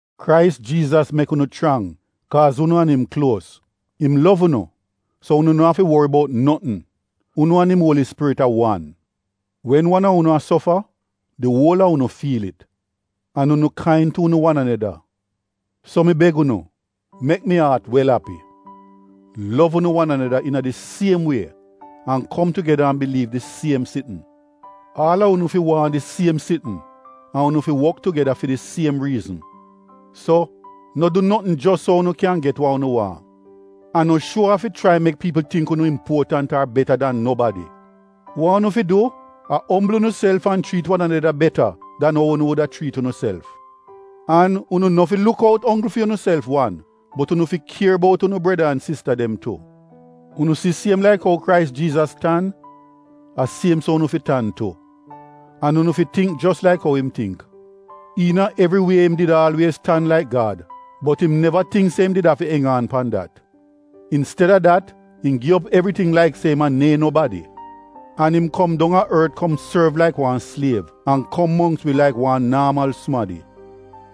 Krais Jiizas mek unu chrang, kaaz unu an im kluos. Im lov unu, so unu no afi wori bout notn. Unu an im Uoli Spirit a wan. Wen wan a unu a sofa di uol a unu fiil it. An unu kain tu unu wan aneda. So mi beg unu mek mi aat wel api: lov unu wan aneda iina di siem wie an kom tugeda an biliiv di siem sitn. Aal a unu fi waahn di siem sitn an unu fi wok tugeda fi di siem riizn. So no du notn jos so unu kyan get wa unu waahn. An no shuo aaf fi chrai mek piipl tingk unu impuotant ar beta dan nobadi. Wa unu fi du a ombl unuself an chriit wan aneda beta dan ou unu wuda chriit unuself. An unu no fi luk out onggl fi unuself wan, bot unu fi kier bout unu breda an sista dem tu. Unu si siem laik ou Krais Jiizas tan, a siem so unu fi tan tu, an unu fi tingk jos laik ou im tingk: Iina evri wie im did aalwiez tan laik Gad, bot im neva tingk se im did afi eng aan pan dat. Insteda dat, im gi op evriting laik se im a neehn nobadi, an im kom dong a ort kom sorv laik wan sliev an kom mongks wi laik wan naamal sumadi.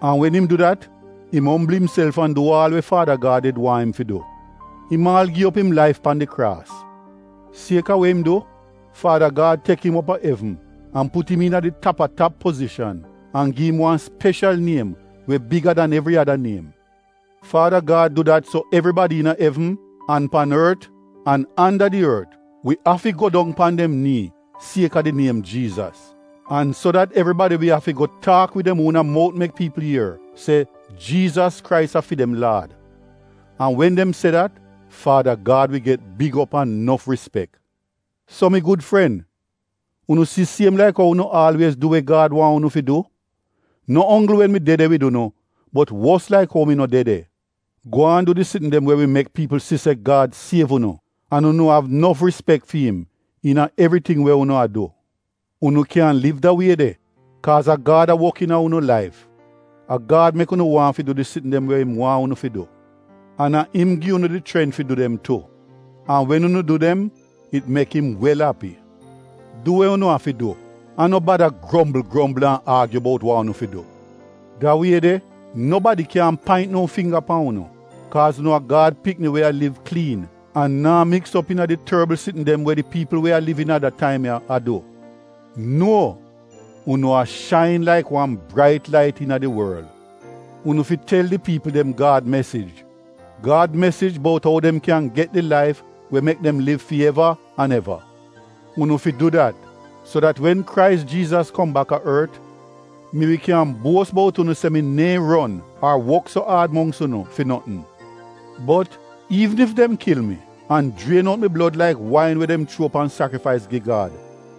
An wen im du dat, im ombl imself an du aal we Faada Gad did waahn im fi du — im aal gi op im laif pan di kraas. Kaaz a we im du, Faada Gad tek im op a evn an put im iina di tap-a-tap pozishan an gi im wan speshal niem we biga dan evri ada niem. Faada Gad du dat so evribadi iina evn, an pan ort an anda di ort wi afi go dong pan dem nii kaaz a di niem Jiizas, an so dat evribadi wi afi go taak wid dem uona mout mek piipl ier, se “Jiizas Krais a fi dem Laad.” An wen dem se dat, Faada Gad wi get big op an nof rispek. So mi gud fren, unu si siem laik ou unu aalwiez du we Gad waahn unu fi du, no onggl wen mi de de wid unu bot wos laik ou mi no de de, gwaan du di sitn dem we wi mek piipl si se Gad siev unu an unu av nof rispek fi im iina evriting we unu a du. Unu kyan liv da wie de, kaaz a Gad a wok iina unu laif. A Gad mek unu waahn fi du di sitn dem we im waahn unu fi du. An a im gi unu di chrent fi du dem tu. An wen unu du dem, it mek im wel api. Du we unu afi du an no bada grombl grombl an aagyu bout wa unu fi du. Da wie de, nobadi kyaahn paint no fingga pan unu, kaaz unu a Gad pikini we a liv kliin an naa miks op iina di torbl sitn dem we di piipl we a liv iina da taim ya a du. Nuo! Unu a shain laik wan brait lait iina di worl. Unu fi tel di piipl dem Gad mesij — Gad mesij bout ou dem kyan get di laif we mek dem liv fi eva an eva. Unu fi du dat, so dat wen Krais Jiizas kom bak a ort, mi wi kyan buos bout unu se mi neehn ron ar wok so aad mongks unu fi notn. Bot iivn ef dem kil mi an jrien out mi blod laik wain we dem chuo pan sakrifais gi Gad,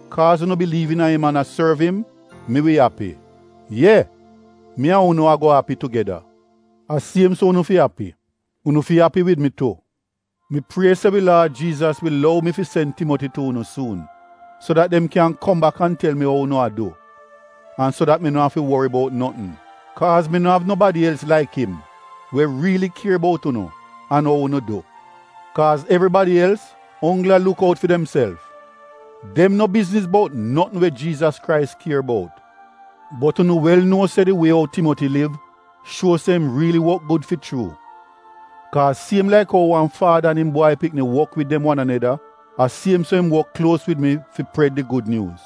kaaz unu biliiv iina im an a sorv im, mi wi api. Ye! Mi an unu ago api tugeda. A siem so unu fi api. Unu fi api wid mi tu. Mi prie se wi Laad Jiizas wi lou mi fi sen Timoti tu unu suun, so dat dem kyan kom bak an tel mi ou unu a du, an so dat mi no afi wori bout notn. Kaaz mi no av nobadi els laik im we riili kier bout unu an ou unu du. Kaaz evribadi els onggl a luk out fi demself. Dem no bizniz bout notn we Jiizas Krais kier bout. Bot unu wel nuo se di wie ou Timoti liv shuo se im riili wok gud fi chuu, kaaz siem laik ou wan faada an im bwai pikni wok wid dem wan aneda, a siem so im wok kluos wid mi fi pred di Gud Nyuuz.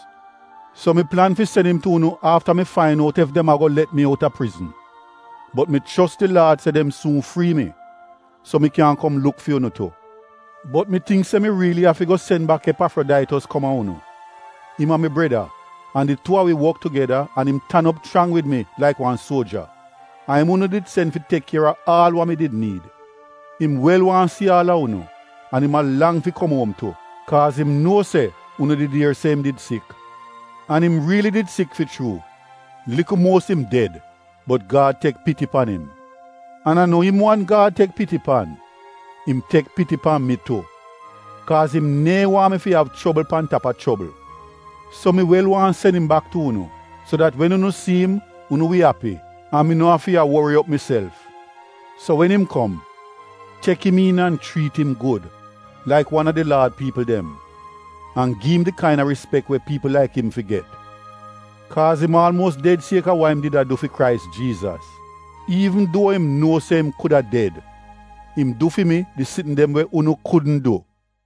So mi plan fi sen im tu unu afta mi fain out ef dem ago let mi outa prizn. Bot mi chos di Laad se dem suun frii mi, so mi kyan kom luk fi unu tu. Bot mi tingk se mi riili afi go sen bak Epafrodaitos kom a unu. Im a mi breda an di tuu a wi wok tugeda an im tan op chrang wid mi laik wan suoja. A im unu did sen fi tek kier a aal wa mi did niid. Im wel waahn si aal a unu, an im a lang fi kom uom tu, kaaz im nuo se unu did ier se im did sik. An im riili did sik fi chuu. Likl muos im ded, bot Gad tek piti pan im. An a no im wan Gad tek piti pan. Im tek piti pan mi tu, kaaz im neehn waahn mi fi av chobl pan tap a chobl. So mi wel waahn sen im bak tu unu, so dat wen unu si im unu wi api an mi wi no afi a wori op miself. So wen im kom, tek im iin an chriit im gud laik wan a di Laad piipl dem, an gi im di kaina rispek we piipl laik im fi get. Kaaz im aalmuos ded sieka wa im did a du fi Krais Jiizas. Iivn duo im nuo se im kuda ded, im du fi mi di sitn dem we unu kudn du.